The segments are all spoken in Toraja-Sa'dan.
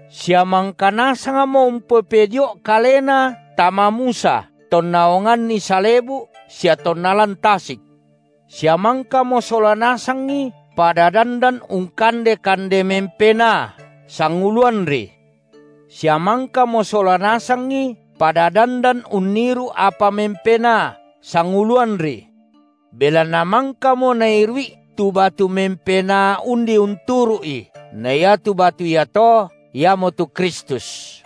sia mangka nasangmo umpopedio’ kalena tama Musa tonna onganni salebu’ sia tonna lan tasik, sia mangkamo sola nasangi pada dandan ungkande kande mempenaa sanguluanri, sia mangkamo sola nasangi pada dandan unniru’ apa mempenaa sanguluanri. Belanna mangkamo nairu’i tu batu mempenaa undi unturu’i, na iatu batu iato, Iamotu Kristus.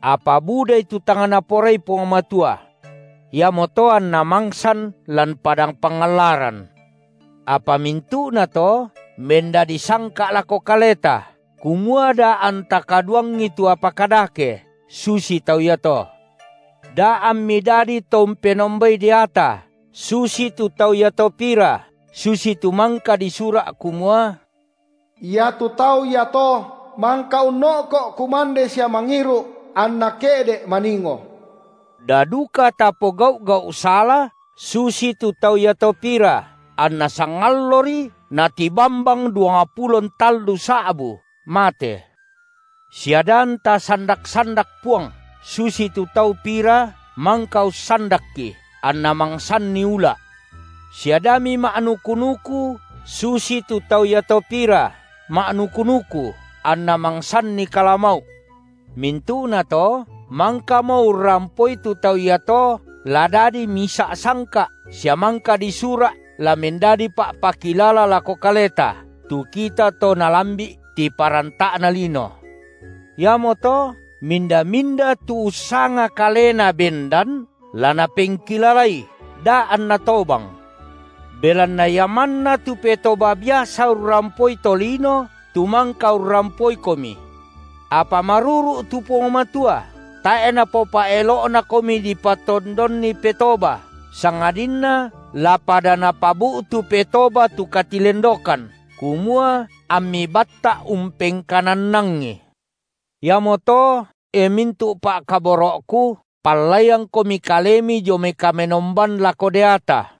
Apa budai tu tang Naporai Puang Matua. Iamoto anna mangsan lan padang pangallaran. Apa mintu’nato mendadi sangka’ lako kaleta, kumua da anta kaduangi tu apa kadake susi tau iato. Da ammi dadi to umpenombai deata, susitu tau iato pira, susitu mangka disura’ kumua: Iatu tau iato mangka unno’ko’ kumande sia mangiru’, anna ke’de’ maningo. Da duka tapogau’ gau’ sala susitu tau iato pira, anna sangallori natibambang duangpulo ntallu sa’bu mate. Sia da anta sandak-sandak Puang, susitu tau iato pira mangka ussandakKi, anna mangsanni ula’. Sia da mima’nuku-nuku susitu tau iato pira ma’nuku-nuku, anna mangsanni kalamau’. Mintu’nato, mangkamo urrampoi tu tau iato la dadi misa’ sangka’ sia mangka disura’ la mendadi pa’pakilala lako kaleta, tu kita to nalambi’ tiparanta’na lino. Iamoto minda-minda tu ussanga kalena bendan, la napengkilalai da’ anna tobang. Belanna ia manna tu petoba biasa urrampoi tolino tu mangka urrampoikomi. Apa maruru’ tu Puang Matua, tae’ Napopa’elo’nakomi dipatondonni petoba, sangadinna la pada Napabu’tu petoba tu katilendokan, kumua ammi batta’ umpengkanannangi. Iamoto, e mintu’ pa’kaboro’ku, pallaiangkomi kalemi dio mai kamenomban lako deata.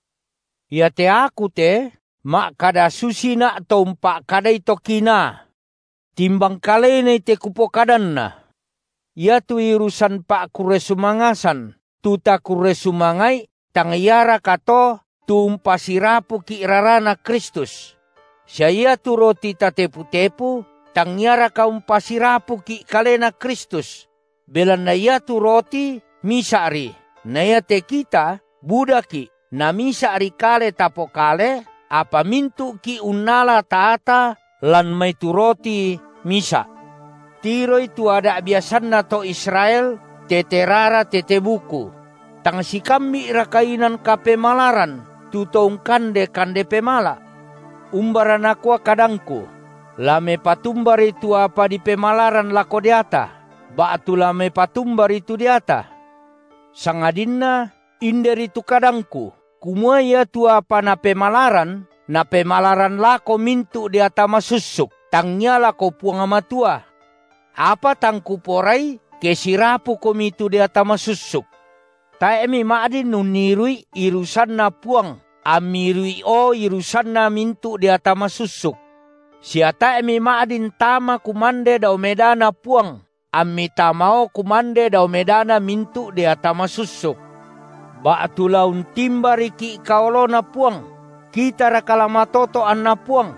Iate aku te ma’kada susina’ to umpa’kadai to kinaa. Timbang kalenai te kupokadanna. Iatu irusan pa’kurre sumangasan tu takurre sumanga’i, tang iaraka to tu umpasirapuki’ raraNa Kristus? Sia iatu roti tatepu-tepu, tangiaraka umpasirapuki’ Kalena Kristus? Belanna iatu roti misa’ri, na iate kita budaki’ namisa’ri kale tapokale, apa mintu’ki’ unnala taata lan mai tu roti misa’. Tiroi tu ada’ biasanna to Israel tete rara tete buku! Tang sikambi’raka inan kapemalaran tu to ungkande kande pemala’? Umbara nakua kadangku? La mepatumbari tu apa dipemalaran lako deata? Ba’tu la mepatumbari tu deata? Sangadinna inderi tu kadangku, kumua iatu apa napemalaran, napemalaran lako mintu’ deata masussuk, tangngia lako Puang Matua. Apa tang kuporai ke sirapukomi tu deata masussuk. Tae’ mima’din unniru’i irusanNa Puang ammi iru’io irusanna mintu’ deata masussuk. Sia tae’ mima’din tama kumande dao medaNa Puang ammi tamao kumande dao medana mintu’ deata masussuk. Ba’tu la untimbariki’ka oloNa Puang? Kitaraka la matoto’ anna Puang?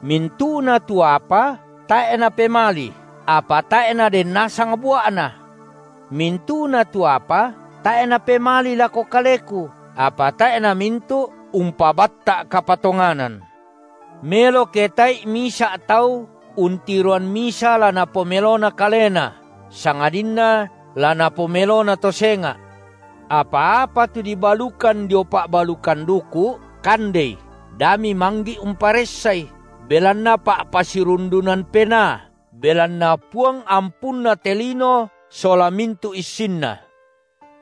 Mintu’na tu apa tae’ napemali, apa tae’ naden nasang bua’na. Mintu’na tu apa tae’ napemali lako kaleku, apa tae’ namintu’ umpabatta’ kapatonganan. Melo ke tae’i misa’ tau untiroan misa la napomelona kalena, sangadinna la napomelona to senga’. Apa-apa tu dibalukan dio pa’balukan duku’, kandei, da mimanggi’ umparessai, belanna pa’pasirundunan penaa, belanna Puang ampunna te lino sola mintu’ issinna.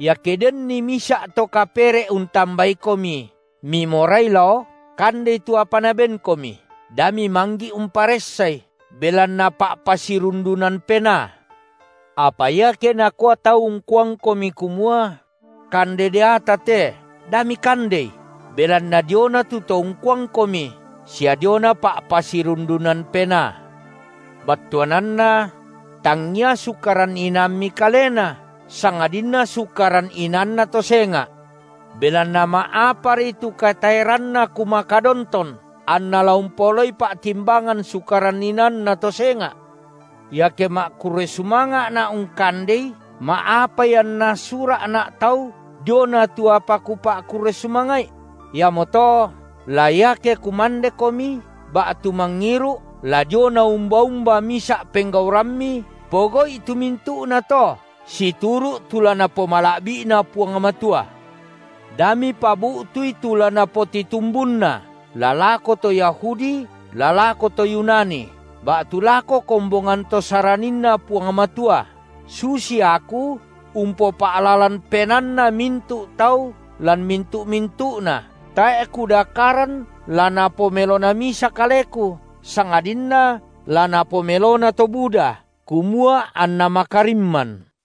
Iake denni misa’ to kapere’ untambaikomi mimorai lao, kandei tu apa nabenkomi, da mimanggi’ umparessai, belanna pa’pasirundunan penaa. Apa iake nakua tau ungkuangkomi kumua: Kande deata te, da mikandei, belanna diona tu to ungkuangkomi, sia diona pa’pasirundunan penaa; battuananna: tangia sukaran inaammi kalena, sangadinna sukaran inaanna to senga’. Belanna ma’apari tu kataeranna kumakadonton anna la umpaolai pa’timbangan sukaran inaanna to senga’? Iake ma’kurre sumanga’na’ ungkandei, ma’apai anna sura’na’ tau diona tu apa kupa’kurre sumanga’i? Iamoto, la iake kumandekomi, ba’tu mangiru’, la diona umba-umba misa’ penggaurammi, pogau’i tu mintu’nato situru’ tu la Napomala’bi’na Puang Matua. Da mipabu’tui tu la napotitumbunna, la lako to Yahudi, la lako to Yunani, ba’tu lako kombongan to SaraninNa Puang Matua, susi aku umpopa’lalan penaanna mintu’ tau lan mintu-mintu’na, tae’ kudakaran la napomelona misa kaleku, sangadinna la napomelona to buda, kumua anna makarimman.